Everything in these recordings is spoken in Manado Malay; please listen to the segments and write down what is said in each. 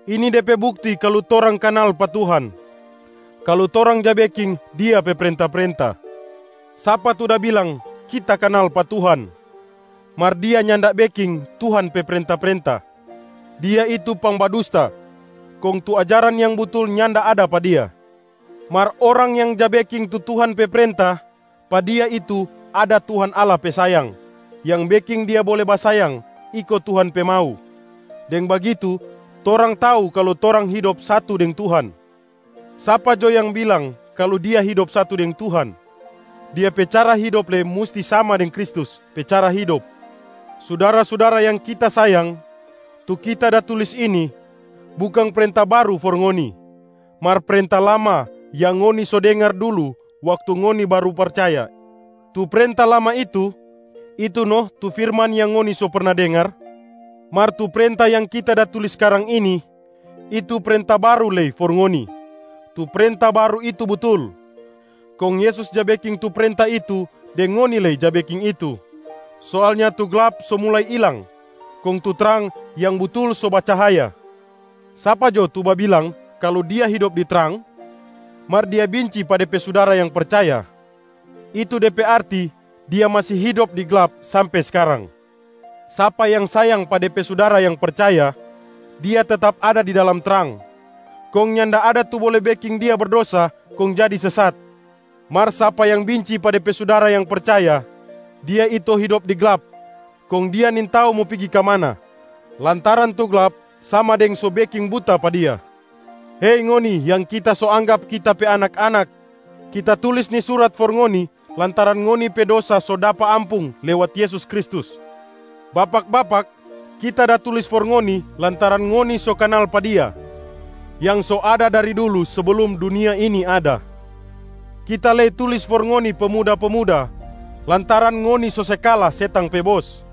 Ini de pe bukti kalu torang kanal pa Tuhan, kalu torang ja beking Dia pe prenta-prenta. Sapa tu da bilang, “Kita kanal pa Tuhan” mar dia nyanda beking Tuhan pe prenta-prenta, dia itu pangbadusta kong tu ajaran yang butul nyanda ada pa dia. Mar orang yang ja beking tu Tuhan pe prenta, pa dia itu ada Tuhan Allah pe sayang yang beking dia bole basayang iko Tuhan pe mau. Deng bagitu torang tau kalu torang hidop satu deng Tuhan. Sapa jo yang bilang kalu dia hidop satu deng Tuhan, dia pe cara hidop lei musti sama deng Kristus pe cara hidop. Sudara-sudara yang kita sayang, tu kita da tulis ini bukang prenta baru for ngoni mar prenta lama yang ngoni so dengar dulu waktu ngoni baru percaya. Tu prenta lama itu, itu no tu firman yang ngoni so perna dengar. Mar tu prenta yang kita da tulis skarang ini, itu prenta baru lei for ngoni. Tu prenta baru itu butul, kong Yesus ja beking tu prenta itu deng ngoni lei ja beking itu. Soalnya tu glap so mulai ilang, kong tu trang yang butul so bacahaya. Sapa jo tu babilang kalu dia hidop di trang mar dia binci pa de pe sudara yang percaya, itu de pe arti dia masi hidop di glap sampe skarang. Sapa yang sayang pa de pe sudara yang percaya, dia tetap ada di dalam trang kong nyanda ada tu bole beking dia berdosa kong jadi sesat. Mar sapa yang binci pa de pe sudara yang percaya, dia itu hidop di glap kong dia nintau mo pigi ka mana, lantaran tu glap sama deng so beking buta pa dia. Hei ngoni yang kita so anggap kita pe anak-anak, kita tulis ni surat for ngoni lantaran ngoni pe dosa so dapa ampung lewat Yesus Kristus. Bapak-bapak, kita da tulis for ngoni lantaran ngoni so kanal pa Dia yang so ada dari dulu seblum dunia ini ada. Kita lei tulis for ngoni pemuda-pemuda lantaran ngoni so se kala setang pe bos.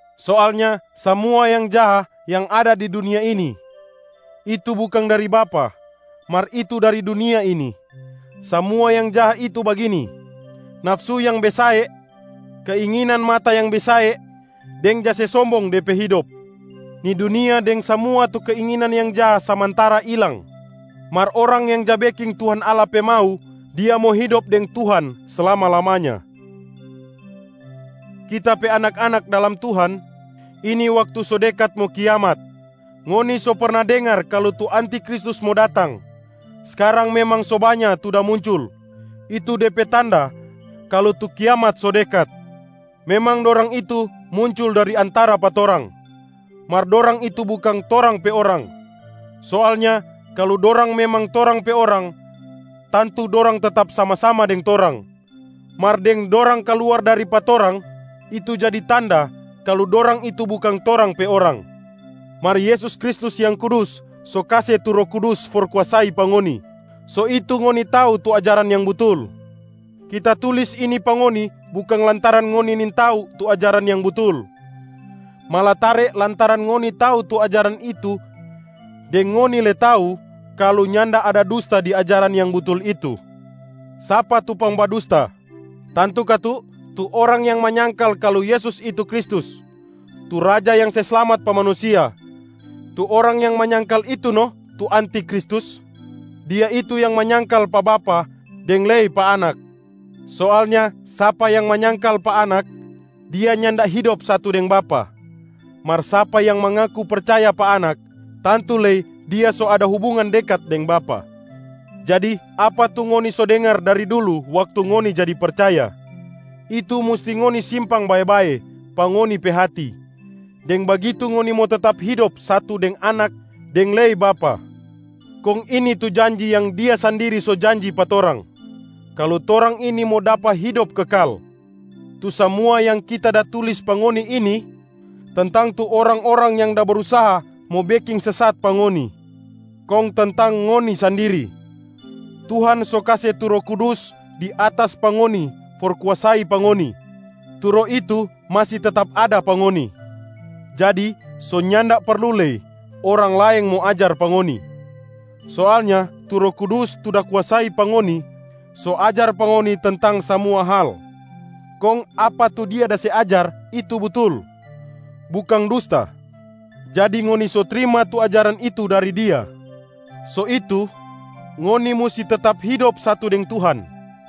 Soalnya samua yang jaha yang ada di dunia ini, itu bukang dari Bapa mar itu dari dunia ini. Samua yang jaha itu bagini: nafsu yang besae, keinginan mata yang besae, deng ja se sombong de pe hidop. Ni dunia deng samua tu keinginan yang jaha samantara ilang, mar orang yang ja beking Tuhan Allah pe mau, dia mo hidop deng Tuhan slama-lamanya. Kita pe anak-anak dalam Tuhan, ini waktu so dekat mo kiamat. Ngoni so perna dengar kalu tu antiKristus mo datang. Skarang memang so banya tu da muncul, itu de pe tanda kalu tu kiamat so dekat. Memang dorang itu muncul dari antara pa torang, mar dorang itu bukang torang pe orang. Soalnya kalu dorang memang torang pe orang, tantu dorang tetap sama-sama deng torang. Mar deng dorang kaluar dari pa torang, itu jadi tanda kalu dorang itu bukang torang pe orang. Mar Yesus Kristus Yang Kudus so kase tu Roh Kudus for kuasai pa ngoni, so itu ngoni tau tu ajaran yang butul. Kita tulis ini pa ngoni bukang lantaran ngoni nintau tu ajaran yang butul, malatare lantaran ngoni tau tu ajaran itu deng ngoni lei tau kalu nyanda ada dusta di ajaran yang butul itu. Sapa tu pangbadusta? Tantu katu tu orang yang manyangkal kalu Yesus itu Kristus, tu Raja yang se slamat pa manusia. Tu orang yang manyangkal itu no tu antiKristus, dia itu yang manyangkal pa Bapa deng lei pa Anak. Soalnya sapa yang manyangkal pa Anak, dia nyanda hidop satu deng Bapa. Mar sapa yang mangaku percaya pa Anak, tantu lei dia so ada hubungan dekat deng Bapa. Jadi apa tu ngoni so dengar dari dulu waktu ngoni jadi percaya, itu musti ngoni simpang bae-bae pa ngoni pe hati. Deng bagitu ngoni mo tetap hidop satu deng Anak deng lei Bapa. Kong ini tu janji yang Dia sandiri so janji pa torang, kalu torang ini mo dapa hidop kekal. Tu samua yang kita da tulis pa ngoni ini tentang tu orang-orang yang da brusaha mo beking sesat pa ngoni. Kong tentang ngoni sandiri, Tuhan so kase tu Roh Kudus di atas pa ngoni for kuasai pa ngoni. Tu Roh itu masi tetap ada pa ngoni, jadi so nyanda perlu lei orang laeng mo ajar pa ngoni. Soalnya tu Roh Kudus tu da kuasai pa ngoni so ajar pa ngoni tentang samua hal, kong apa tu Dia da se ajar itu butul, bukang dusta. Jadi ngoni so trima tu ajaran itu dari Dia, so itu ngoni musti tetap hidop satu deng Tuhan.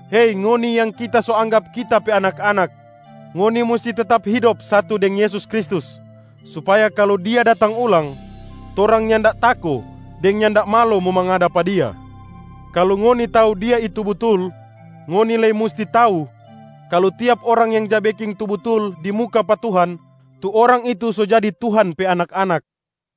Hei ngoni yang kita so anggap kita pe anak-anak, ngoni musti tetap hidop satu deng Yesus Kristus supaya kalu Dia datang ulang, torang nyanda tako deng nyanda malo mo mangada pa Dia. Kalu ngoni tau Dia itu butul, ngoni lei musti tau kalu tiap orang yang ja beking tu butul di muka pa Tuhan, tu orang itu so jadi Tuhan pe anak-anak.